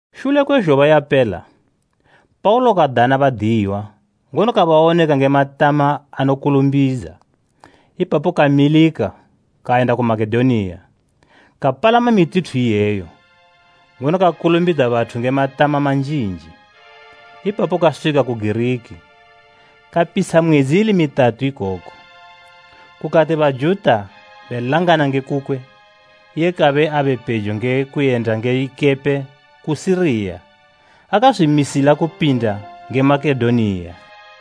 Shule kwe zhoba yapela, Paulo kadana badiyiwa ngono kabawoneka nge matama ano kulumbidza. Ipapo kamilika kayenda ku Makedoniya. Kapalama mituthu iyeyo, ngono kakulumbidza bathu nge matama manjinji. Ipapo kaswika ku Giriki. Kapitsha mwedzi ili mitatu ikoko. Kukati Bajuta belangana nge kukwe, iye kabe abe pejo nge kuyenda nge ikepe ku Siriya akazwimisila kupinda nge Makedoniya.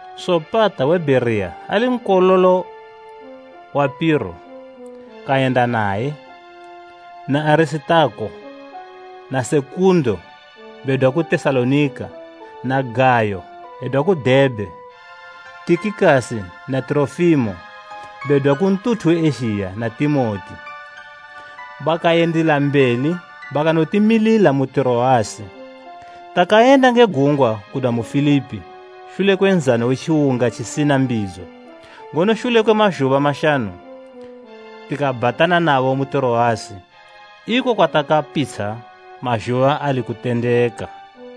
Sopata we Bhereya ali nkololo wa Piro, kayenda naye; na Arisitako na Sekundo bedwa ku Tesalonika; na Gayo, edwa ku Debhe; Tikikasi na Tirofimo, bedwa ku ntuthu we Ezhiya na Timoti. Bakayendila mbeli bakanotimilila mu Tiroasi. Takayenda nge gungwa kudwa mu Filipi shule kwe Nshingo we tjiwunga tjisina mbidzo, ngono shule kwe mazhuba mashanu tikabhatana nabo mu Tiroasi, iko kwatakapitsha mazhuba ali kutendeka.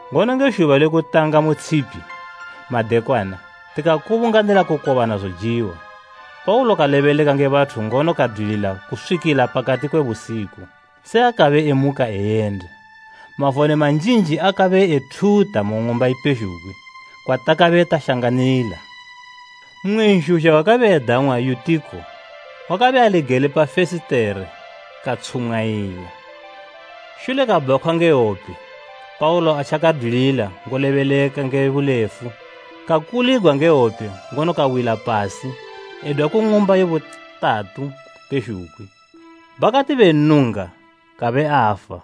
Ngono nge zhuba le kutanga mu tshipi madekwana tikakubunganila kukobana zojiwa. Paulo kalebeleka nge bathu ngono kadwilila kuswikila pakati kwe busiku, se akabe emuka eyenda. Mavone manjinji akabe ethuta mu ng'umba ipezhugwi kwatakabe tashanganila. Mmwe nzhuzha wakabe edang'wa Yutiko wakabe ali gele pa fesitere katshumwayila, shule kabhakhwa nge hwope Paulo atjakadwilila ngolebeleka nge bulefu, kakuligwa nge hwope ngono kawila pasi edwa ku ng'umba ye butatu pezhugwi. Bakati bennunga, kabe afa.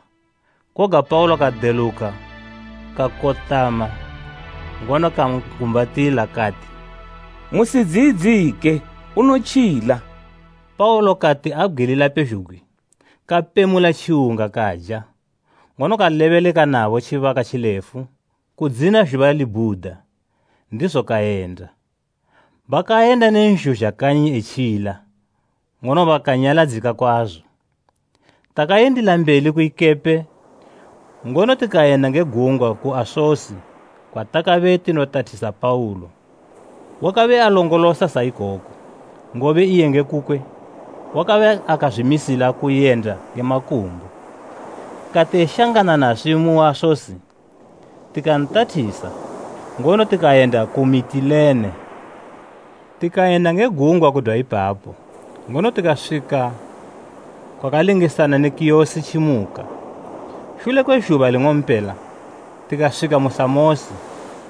Koga Paulo kadeluka kakotama ngono kan'gumbatila. Kati, “Musidziyidzike unotjila!” Paulo kati abgwilila pezhugwi, kapemula tjiwunga kaja, ngono kalebeleka nabo tjibaka tjilefu kudzina zhuba libhuda, ndizo kayenda. Bakayenda ne nzhuzha kanyi etjila, ngono bakanyaladzika kwazo. Takayendila mbeli ku ikepe ngono tikayenda nge gungwa ku Asosi, kwatakabe tinotathisa Paulo. Wakabe alongolosa sa ikoko, ngobe iye nge kukwe wakabe akazwimisila kuyenda nge makumbo. Kati eshangana naswi mu Asosi tikantathisa ngono tikayenda ku Mitilene. Tikayenda nge gungwa kudwa ipapo, ngono tikaswika kwakalingisana ne Kiyosi tjimuka. Shule kwe zhuba ling'ompela tikaswika ku Samosi,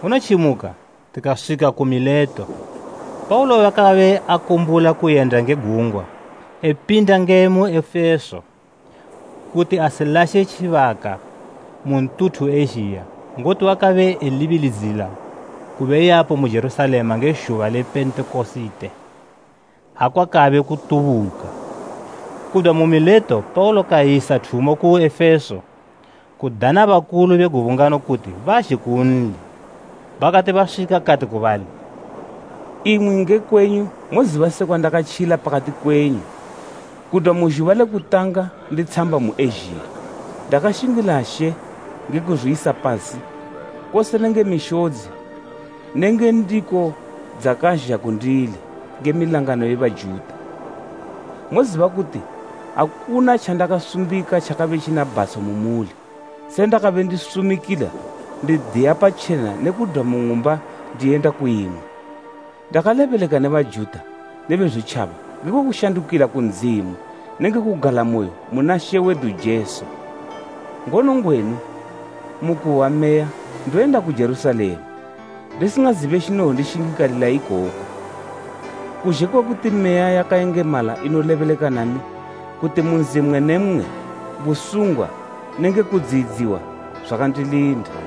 ngono tjimuka tikaswika ku Mileto. Paulo wakabe akumbula kuyenda nge gungwa epinda nge mu Efeso, kuti asilashe tjibaka mu ntuthu we Ezhiya ngoti wakabe elibilidzila kube yapo mu Jerusalema nge zhuba le Pentekosite, ha kwakabe kutubuka. Kudwa mu Mileto Paulo kayisa thumo ku Efeso, kudana bakulu be gubungano kuti bazhe kunli. Bakati baswika kati ku bali, “Imwi nge kwenyu moziba sekwa ndakatjila pakati kwenyu kudwa mu zhuba le kutanga nditshamba mu Ezhiya. Ndakashingila She nge kuzwiyisa pasi kose nenge mishodzi nenge ndiko dzakazha kundili nge milangano ye Bajuta. Moziba kuti akuna tjandakasumbika tjakabe tjina bhatsho mu muli se ndakabe ndisumikila ndidiya patjena ne kudwa mu ng'umba ndiyenda kuyimwe. Ndakalebeleka ne Bajuta ne Bezwitjaba ngekwe kushandukila ku Ndzimu nenge kugalamoyo muna She wedu Jesu. Ngono ngwenu, mu kuhwa Meya, ndoyenda ku Jerusalema, ndisingazibe tjinowonondishingikalalila ikoko, kuzhe kwe kuti Meya yakayengemala inolebeleka nami kuti mu nzi mmwe ne mmwe busungwa nenge kudziyidziwa zwakandilinda.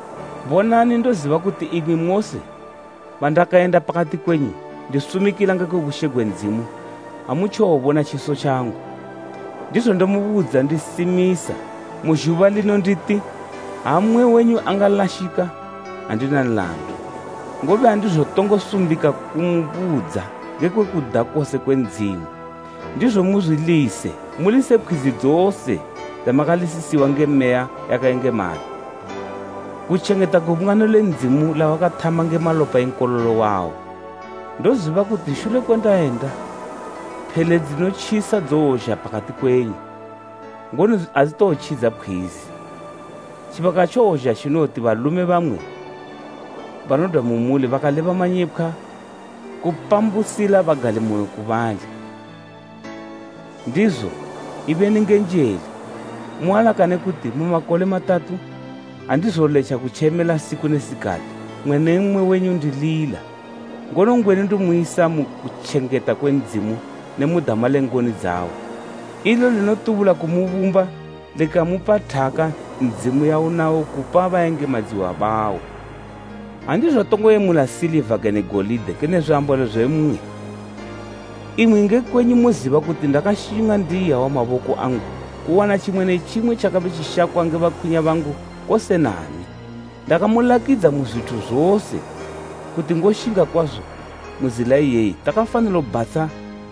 “Bonani ndoziba kuti imwi mose bandakayenda pakati kwenyu ndisumikila ngekwe bushe gwe Ndzimu amutjowobona tjiso tjangu. Ndizo ndomubudza ndisimisa mu zhuba lino nditi, ha mmwe wenyu angalashika, andina nlandu. Ngobe andizotongo sumbika kumubudza ngekwe kuda kose kwe Ndzimu. Ndizo muzwilise, mulise pkhwizi dzose dzamakalisisiwa nge Meya yakayengemala, kutjengeta gubungano le Ndzimu, lawakathama nge malopa e Nkololo wawo. Ndoziba kuti shule kwe ndayenda, phele dzinotjisa dzowozha pakati kwenyu, ngono adzitowotjidza pkhwizi. Tjibaka tjowozha tjinowoti balume bamwe banodwa mu muli bakaleba manyepkhwa kupambusila bagalimoyo ku bali. Ndizo, ibeni nge njele, mualakane kuti mu makole matatu, andizoletja kutjemela siku ne sikati mmwe ne mmwe wenyu ndilila. “Ngono ngwenu ndomuyisa mu kutjengeta kwe Ndzimu ne mu dama le ngoni dzawo, ilo linotubula kumubumba likamupa thaka Ndzimu yaunayo kupa bayengemadziwa bawo. Andizotongo yemula siliva kene golide kene zwiambalo zwimwe. Imwi nge kwenyu moziba kuti ndakashinga ndi iyawa maboko angu kuwana tjimwe ne tjimwe tjakabe tjishakwa nge bakwinya bangu kose nami. Ndakamulakidza mu zwithu zose kuti ngoshinga kwazo mu zila iyeyi takafanilo bhatsha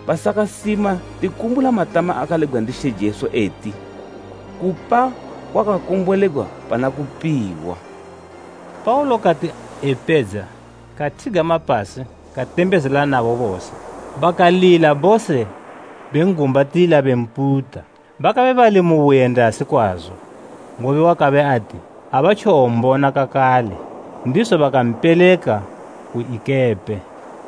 basakasima tikumbula matama akalebgwa ndi She Jesu eti, ‘Kupa kwakakombolegwa pana kupiwa!’” Paulo kati epedza, kathigama pasi katembezela nabo bose. Bakalila bose ben'gumbatila bemputa. Bakabe bali mu buyendasi kwazo, ngobe wakabe ati abatjowombona kakale. Ndizo bakampeleka ku ikepe.